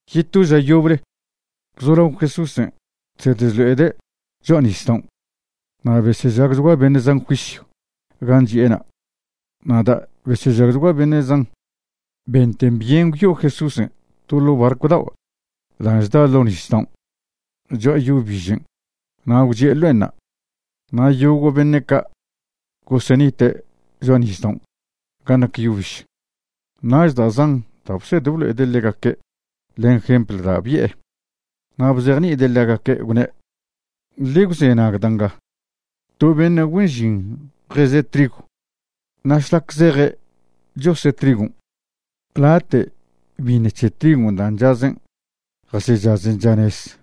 Yeto ža yoble gwzolao Jesúsen' chsed chlo'ede' cho'a nisdaon', na' besežagchgua beṉe' zan juisyw gan' chi'ena'. Na' da' besežagchgua beṉe' zan, benten byen gwyo'o Jesúsen' to ḻo' barcw dao' da' chda' ḻo nisdaon' cho'a yo bižen' na' gwchi'e ḻo'enṉa', na' yogo' beṉe' ca' gosenite' cho'a nisdaon' ga nac yo biž. Nach da' zan da' bsed blo'ede' ḻegaque' len jempl da' bi'e. Na' bzejni'ide' ḻegaque', gwne': ―Ḻe gwzenag da' nga: To beṉe' güen žin jeze' trigw. Na' šlac zeje' chose' trigon', late' biṉ c̱he trigw dan' chazen' jasechazen chanez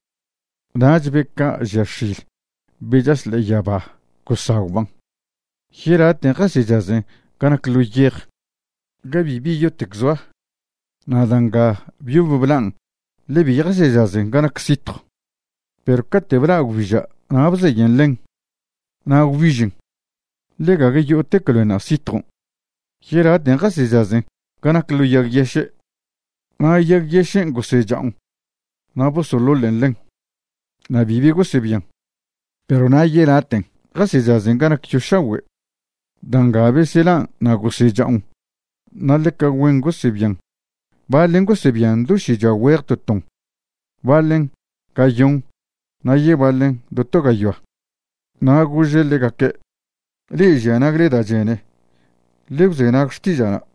nach be ca' žia x̱il be chaš ḻe'e yaba gosagwban'. Yelaten' jasechazen ga nac ḻo yej, ga bibi yotec zoa, na' da' nga byob blan' ḻe bi jasechazen ga nac sitjw. Perw cate' bla' gwbiža' na' bzeyen ḻen na' gwbižen, ḻe gague yo'otec loenṉa' sitjon'. Yelaten' jasechazen ga nac ḻo yag yeše', na' yag yešen' gosecha'on na' bosoḻoḻen' ḻen, na' bibi gosebian. Perw na' yelaten' jasechazen ga nac yo šagüe'. Da' nga beselan' na' gosecha'on na' ḻeca güen gosebian, baḻen gosebian do šichoa güeje to ton, baḻen gayon, na' yebaḻen do to gayoa. Na' gože' ḻegaque': ―Le'e žia nagle da' chene, ḻe gwzenag xtiža'na'.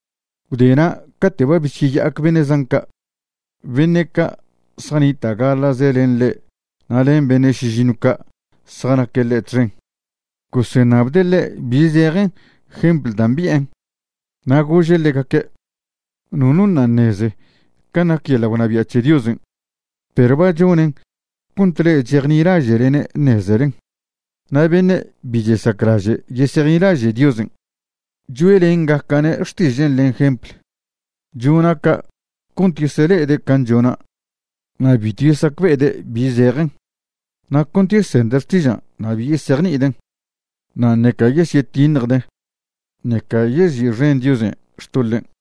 Gwdena' cate' ba besyeya'ac beṉe' zan ca', beṉe' ca' zjanita' gaḻa'ze len ḻe' na' len beṉe' šižiṉw ca' zjanaque' ḻe' txen, goseṉabde' ḻe' bi zejen jempl dan' bi'en. Na' gože' ḻegaque': ―Nono ṉa' ṉeze can' nac yeḻa' gwnabia' c̱he Diosen', perw ba chone' cont le'e chejnilaže'lene' ṉezelen. Na' beṉe' bi chesaclaže' yesejnilaže' Diosen', choe'lengaca'ne' xtižen' len jempl. Chona' ca' cont yesele'ede' can' chonan' na' bitw yesacbe'ede' bi zejen, na' cont yesende' xtižan' na' bi yesejni'iden', na' ṉeca yesyetiṉjde', ṉeca yezi'xen Diosen' xtoḻen'.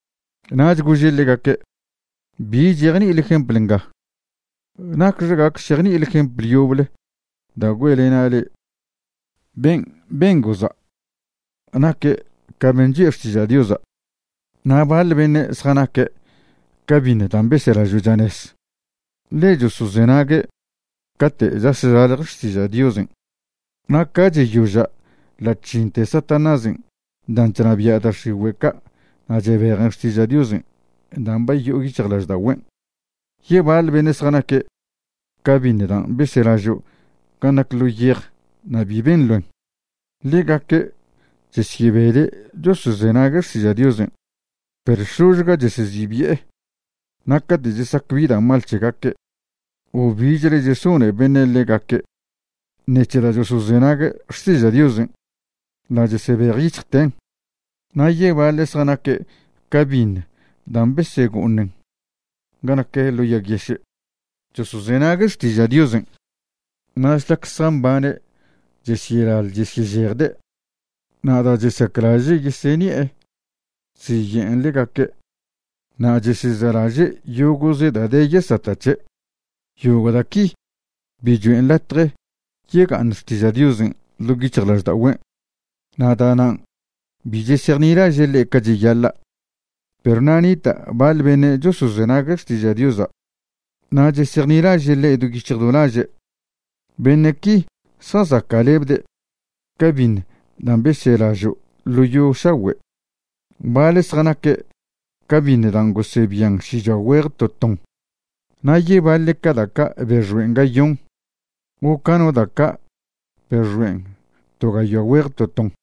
Nach gože' ḻegaque': ―¿Bi chejni'ile jempl nga? ¿Nacxe gac šejni'ile jempl yoble da' güe'lena' le'e? Ben' ben goza' naque' ca ben' choe' xtiža' Diosa'. Na' baḻ beṉe' zjanaque' ca biṉ dan' beselažo' chanez, ḻe chosozenague' cate' chas chlalje xtiža' Diosen', na' ca cheyoža' ḻa' chžinte Satanásen' dan' chnabia' da' x̱igüe' ca' na' chebejen xtiža' Diosen' dan' ba yo'o yic̱hjlažda'ogüen'. Yebaḻ beṉe' zjanaque' ca biṉ dan' beselažo' ga nac ḻo yej na' bi ben loen. Ḻegaque' chesyebede' chosozenague' xtiža' Diosen', perw šložga chesezibi'e, na' cate' chesac bi da' mal c̱hegaque' o bichle chesone beṉe' ḻegaque' ṉec̱he da' chosozenague' xtiža' Diozen', ḻa' chesebejyic̱hjten'. Na' yebaḻe' zjanaque' ca biṉ dan' besego'oṉen ga nac ḻo yag yeše'. Chosozenague' xtiža' Diosen', na' šlac zjambane' chesyelaḻ chesyežejde', na' da' chesaclaže' yeseṉi'e chziye'en ḻegaque' na' chesezelaže' yogo'ze da' de yesata' c̱he'. Yogo' da' qui bi choen' latje yega'aṉ xtiža' Diosen' ḻo' yic̱hjlažda'ogüen' na' da'nan' bi chesejnilaže' ḻe' ca cheyaḻa'. Perw na' nita' baḻ beṉe' chosozenague' xtiža' Diosa' na' chesejnilaže' ḻe' do yic̱hj do laže', beṉe' qui zjazaca'lebde' ca biṉ dan' beselažo' ḻo yo šagüe'. Baḻe' zjanaque' ca biṉ dan' gosebian šichoa güeje to ton, na' yebaḻe' ca da' ca' bexoen' gayon, o ca no da' ca' bexoen' to gayoa güeje to ton.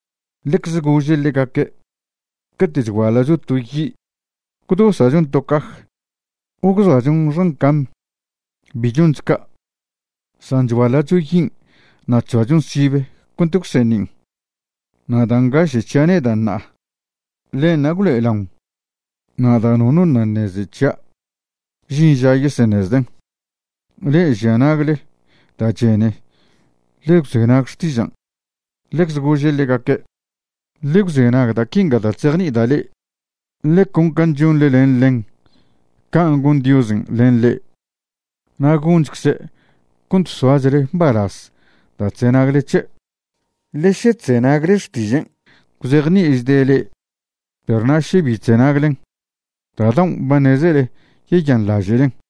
Ḻecze gože' ḻegaque': ―Cate' chguaḻa'cho to yi' ¿gwdosa'chon to caj o gwzoachon xan cam? Bi choncho ca', san chguaḻa'cho yin' na' chzoachon sibe cont gwseṉin'. Na' da' ngaše' c̱hia' neda' ṉa'a, ḻenṉa' gwlo'elaon, na' da' nono ṉa' ṉeze c̱hia', žin ža yeseṉezden'. Le'e žia nagle da' chene, ḻe gwzenag xtižan'. Ḻecze gože' ḻegaque': ―Ḻe gwzenag da' quingan' da' chzejni'ida' le'e. Ḻe con can' chonḻe len ḻen, can' gon Diosen' len le'e. Na' gonchcze' cont soachle mbalaz da' chzenagle c̱he'. Ḻe še chzenagle xtižen' gwzejni'ichde' le'e, perw na' še bi chzenaglen, da' daon' ba ṉezele yeyanḻaže'len.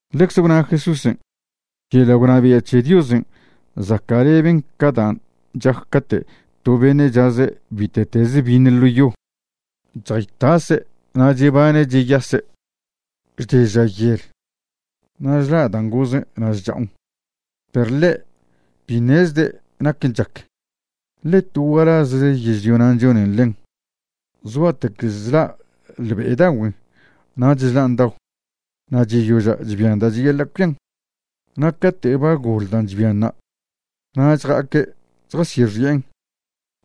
Ḻecze gwna Jesúsen': ―Yeḻa' gwnabia' c̱he Diosen' zaca'leben ca dan' chac cate' to beṉe' chaze' bite'teze biṉ ḻo yo. Chjaytase' na' chebane' cheyase', chde ža yel, na' chla' dan' gozen' na' chcha'on, perw ḻe' bi ṉezde' naquen' chac. Ḻe to gualazze yežlio nan' chonen ḻen, zgua'tec chla' ḻbe'edagüen', nach chlan' dao, na' cheyoža' chbian da' cheyaḻa' cuian. Na' cate' ba goḻ dan' chbianṉa' na' chja'aque' chjasyexi'en,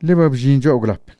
ḻe ba bžin cho'a gwlap.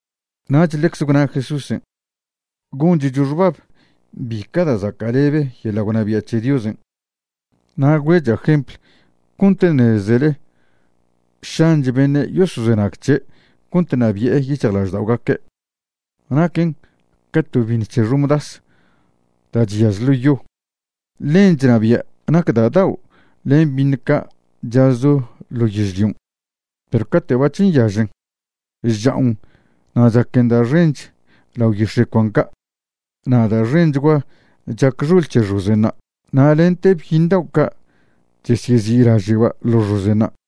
Nach ḻecze gwna Jesúsen': ―Gonchcho xbab bi ca da' zaca'lebe yeḻa' gwnabia' c̱he Diosen' na' güe'cha' jempl cont ṉezele šanch beṉe' yosozenag c̱he' cont ṉabi'e yic̱hjlažda'ogaque'. Naquen ca to biṉ c̱he xomdas da' chyaž ḻo yo. Ḻen chnabia' nac da' dao' len biṉ ca' chazcho ḻo yežlion'. Perw cate' bac̱h nyažen, chcha'on na' chaquen da' xench lao yix̱e' cuan ca', na' da' xenchgua chac xol c̱he xozenṉa', na' lente byiṉ dao' ca' chesyezi'laže'ba' ḻo xozenṉa'.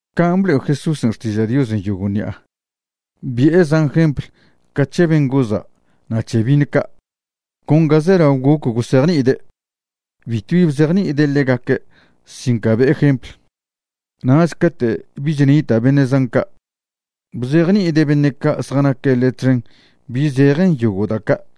Can' blo'e Jesúsen' xtiža' Diosen' yogo' ṉi'a, bi'e zan jempl ca c̱he ben' goza' na' c̱he biṉ ca', con ga zelao goc gosejni'ide'. Bitwbi bzejni'ide' ḻegaque' sin ca be'e jempl, nach cate' bich nita' beṉe' zan ca', bzejni'ide' beṉe' ca' zjanaque' ḻe' txen bi zejen yogo' da' ca'.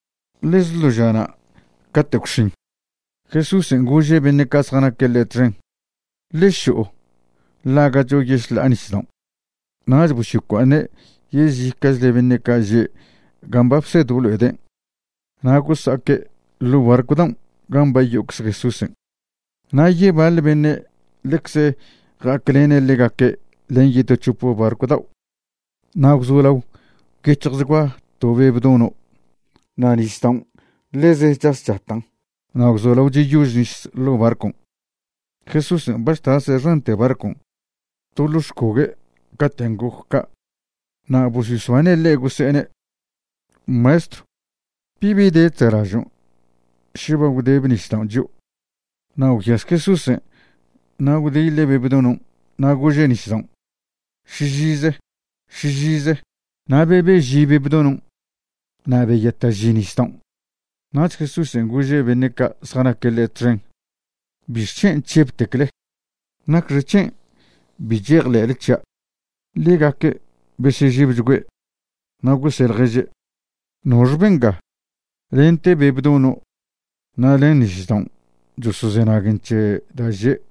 Ḻeze ḻo žana' cate' gwx̱in, Jesúsen' gože' beṉe' ca' zjanaque' ḻe' txen: ―Ḻe šo'o ḻaga'cho yešḻa'a nisdaon'. Nach bosyocua'aṉe' yezica'chle beṉe' ca' že' gan' ba bsed blo'ede' na' gosa'aque' ḻo' barcw daon' gan' ba yo'ocze Jesúsen'. Na' yebaḻ beṉe' ḻecze ja'aclene' ḻegaque' len yeto c̱hop barcw dao'. Na' gwzolao gwyec̱hjchgua to be' bdono' na' nisdaon' ḻeze chas chatan', na' gwzolao cheyož nis ḻo' barcon'. Jesúsen' ba chtase' xante barcon' to ḻo xcogue' caten' goc ca'. Na' bosyosbane' ḻe' gose'ene': ―¡Maestro! ¿Bibi de chza'lažon' še ba gwdebe nisdaon' chio'? Nach gwyas Jesúsen' na' gwdiḻe' be' bdonon' na' gože' nisdaon': ―¡Šižize! ¡Šižize! Na' bebe'ži be' bdonon' na' beyata'ži nisdaon'. Nach Jesúsen' gože' beṉe' ca' zjanaque' ḻe' txen: ―¿Bixc̱hen' chžebtecle? ¿Nacxec̱hen' bi chejḻe'le c̱hia'? Ḻegaque' besežebchgüe' na' gose' ḻježe': ―¿Noxe benga? lente be' bdono' na' len nisdaon' chosozenaguen c̱he da' že'.